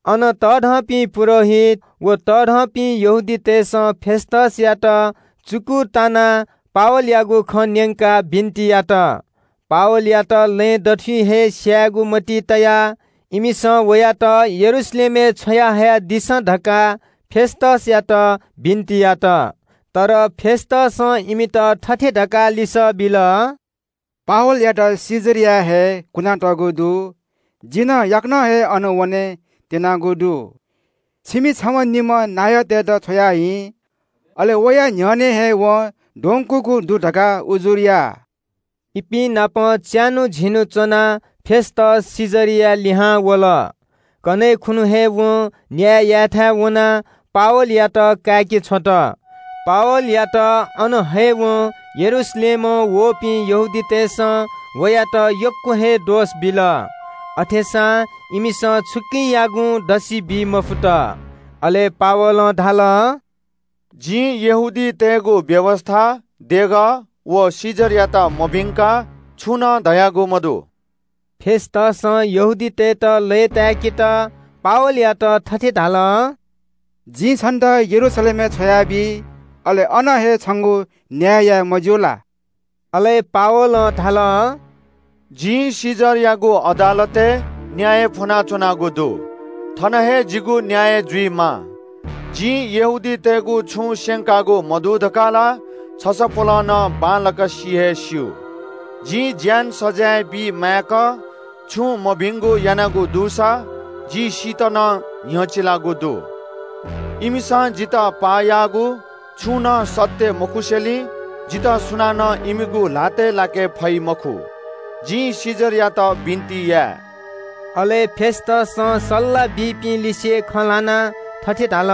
अन तःधंपिं पुजाहारीत व तःधंपिं यहूदीतय् नायःतय्‌सं फेस्‍तसयात पावलयागु विरोधय् खँ न्‍यंकाः बिन्‍ति यात। पावलयात लँय् दथुइ हे स्‍यायेगु मतिइ तयाः इमिसं वयात यरूशलेमय् छ्वयाहयादिसँ धकाः फेस्‍तसयात बिन्‍ति यात। तर फेस्‍तसं इमित थथे धकाः लिसः बिल – “पावलयात कैसरियाय् हे कुनातःगु दु। जि नं याकनं हे अन वनेत्‍यनागु दु। छिमि छम्‍हनिम्‍ह नायःतय्‌त छ्वयाहिँ। अले वया न्‍ह्यःने हे वं द्वंकूगु दु धकाः उजुर या।” इपिं नाप च्‍यान्‍हु झिन्‍हु च्‍वनाः फेस्‍तस कैसरियाय् लिहां वल। कन्‍हय् खुन्‍हु हे वं न्‍याय यायेथाय् वनाः पावलयात काय्‌के छ्वल। पावलयात अन हयेवं यरूशलेमं वःपिं यहूदीतय् नायःतय्‌सं वयात यक्‍व हे दोष बिल। अथेसां इमिसं छुकियागुं दसि बी मफुत। अले पावलं धाल – “जिं यहूदीतय्‌गु व्‍यवस्‍था, देगः, व कैसरयात मभिंकाः छुं नं धयागु मदु।” फेस्‍तसं यहूदीतय्‌त लय्‌ताय्‌केत पावलयात थथे धाल – “जिं छन्‍त यरूशलेमय् छ्वयाबी, अले अन हे छंगु न्‍याय याये, मज्‍यू ला?” अले पावलं धाल – “जिं कैसरयागु अदालतय् न्‍याय फ्‍वनाच्‍वनागु दु। थन हे जिगु न्‍याय जुइमाः। जिं यहूदीतय् नायःतय्‌गु छुं स्‍यंकागु मदु धकाः ला छसपोलं नं बांलाक सि हे स्‍यू। जिं ज्‍यान सजाँय बीमाय्‌क छुं मभिंगु यानागु दुसा जि सीत नं न्‍ह्यचिलागु दु। इमिसं जितः पाः याःगु छुं नं सत्‍य मखुसेंलि जितः सुनानं इमिगु ल्‍हातय् लाके फइ मखु। जिं कैसरयात बिन्‍ति याये।” अले फेस्‍तसं सल्‍लाह बीपिं लिसे खँ ल्‍हानाः थथे धाल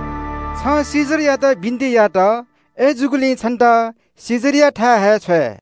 – “छं कैसरयात बिन्‍ति यात। अय्‌जूगुलिं छन्‍त कैसरयाथाय् हे छ्वये।”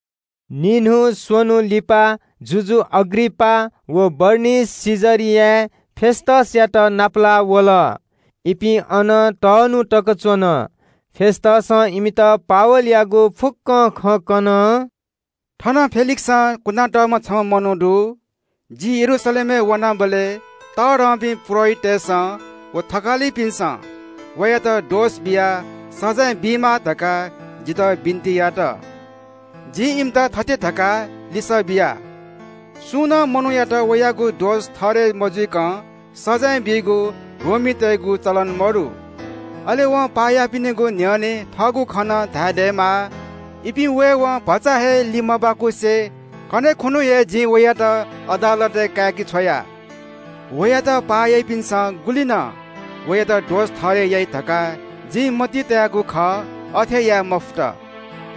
निन्‍हु स्‍वन्‍हु लिपा जुजु अग्रिपास व बरनिकी कैसरियाय् फेस्‍तसयात नापलाः वल। इपिं अन छुं न्‍हि तक च्‍वने धुंकाः फेस्‍तसं जुजुयात पावलयागु फुक्‍क खँ कन – “थन फेलिक्‍सं कुनातःम्‍ह छम्‍ह मनू दु। जि यरूशलेमय् वनाबलय् तःधंपिं पुजाहारीतय्‌सं व थकालिपिन्‍सं वयात दोष बियाः सजाँय बीमाः धकाः जितः बिन्‍ति यात। जिं इमित थथे धकाः लिसः बिया – ‘सुनानं मनूयात वयागु दोष ठहरय् मजुइकं सजाँय बीगु रोमीतय्‌गु चलन मदु। अले वं पाः याःपिनिगु न्‍ह्यःने थःगु खँ नं धाये दयेमाः।’ “इपिं वयेवं भचा हे लिमबाकुसे कन्‍हय् खुन्‍हु हे जिं वयात अदालतय् काय्‌के छ्वया। वयात पाः याःपिन्‍सं गुलि नं वयात दोष ठहरय् याइ धकाः जिं मतिइ तयागु खः, अथे याये मफुत।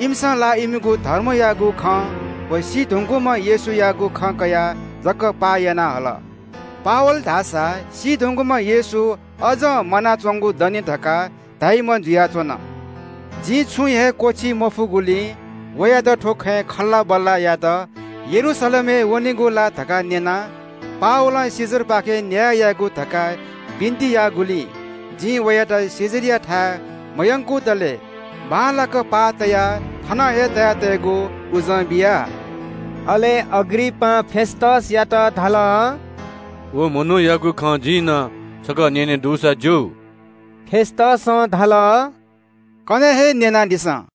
इमिसं ला इमिगु धर्मयागु खँ व सी धुंकूम्‍ह येशूयागु खँ कयाः जकं पाः याना हल। पावल धाःसा सी धुंकूम्‍ह येशू अज्‍जं म्‍वानाच्‍वंगु दनि धकाः धाइम्‍ह जुयाच्‍वन। जिं छुं हे क्‍वःछी मफुगुलिं वयात थ्‍व खँय् जवाःसवाः यायेत यरूशलेमय् वनेगु ला धकाः न्‍यना। पावलं कैसरपाखें न्‍याय याकेगु धकाः बिन्‍ति याःगुलिं जिं वयात कैसरयाथाय् मयंकुतले बांलाक पाः तयाः थन हे तया तयेगु उजं बिया।” अले अग्रिपासं फेस्‍तसयात धाल – “व मनूयागु खँ जिं नं छकः न्‍यने दुसा ज्‍यू।” फेस्‍तसं धाल – “कन्‍हय् हे न्‍यनादिसँ।”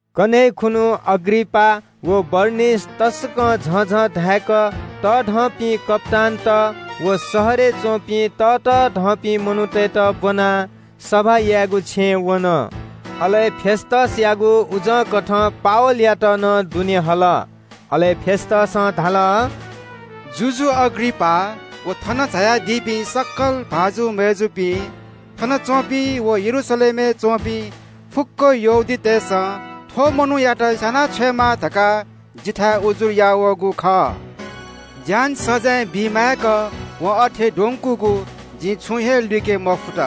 कन्‍हय् खुन्‍हु अग्रिपास व बरनिकी तसकं झःझः धाय्‌क तःधंपिं कप्‍तानत व शहरय् च्‍वंपिं ततःधंपिं मनूतय्‌त ब्‍वनाः सभा यायेगु छेँय् वन। अले फेस्‍तसयागु उजंकथं पावलयात नं दुने हल। अले फेस्‍तसं धाल – “जुजु अग्रिपास व थन झायादीपिं सकल भाजु मय्‌जुपिं, थनच्‍वंपिं व यरूशलेमय् च्‍वंपिं फुक्‍क यहूदीतय्‌सं थ्‍व मनूयात स्‍याना छ्वयेमाः धकाः जिथाय् उजुर याः वःगु खः। ज्‍यान सजाँय बीमाय्‌क वं अथे द्वंकूगु जिं छुं हे लुइके मफुत।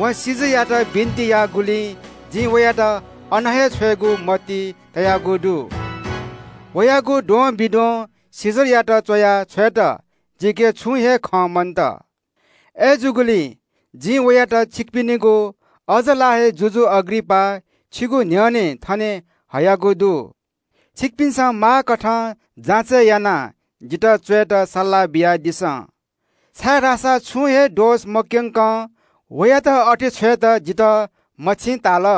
वं कैसरयात बिन्‍ति याःगुलिं जिं वयात अन हे छ्वयेगु मतिइ तयागु दु। “वयागु द्वंबिद्वं कैसरयात च्‍वया छ्वयेत जिके छुं हे खँ मन्‍त। अय्‌जूगुलिं जिं वयात छिकपिनिगु, अज्‍ज ला हे जुजु अग्रिपास, छिगु न्‍ह्यःने थने हयागु दु। छिकपिन्‍सं माःकथं जाँचय् यानाः जितः च्‍वयेत सल्‍लाह बियादिसँ, छाय्‌धाःसा छुं हे दोष मक्‍यंकं वयात अथे छ्वयेत जितः मछिं ताल।”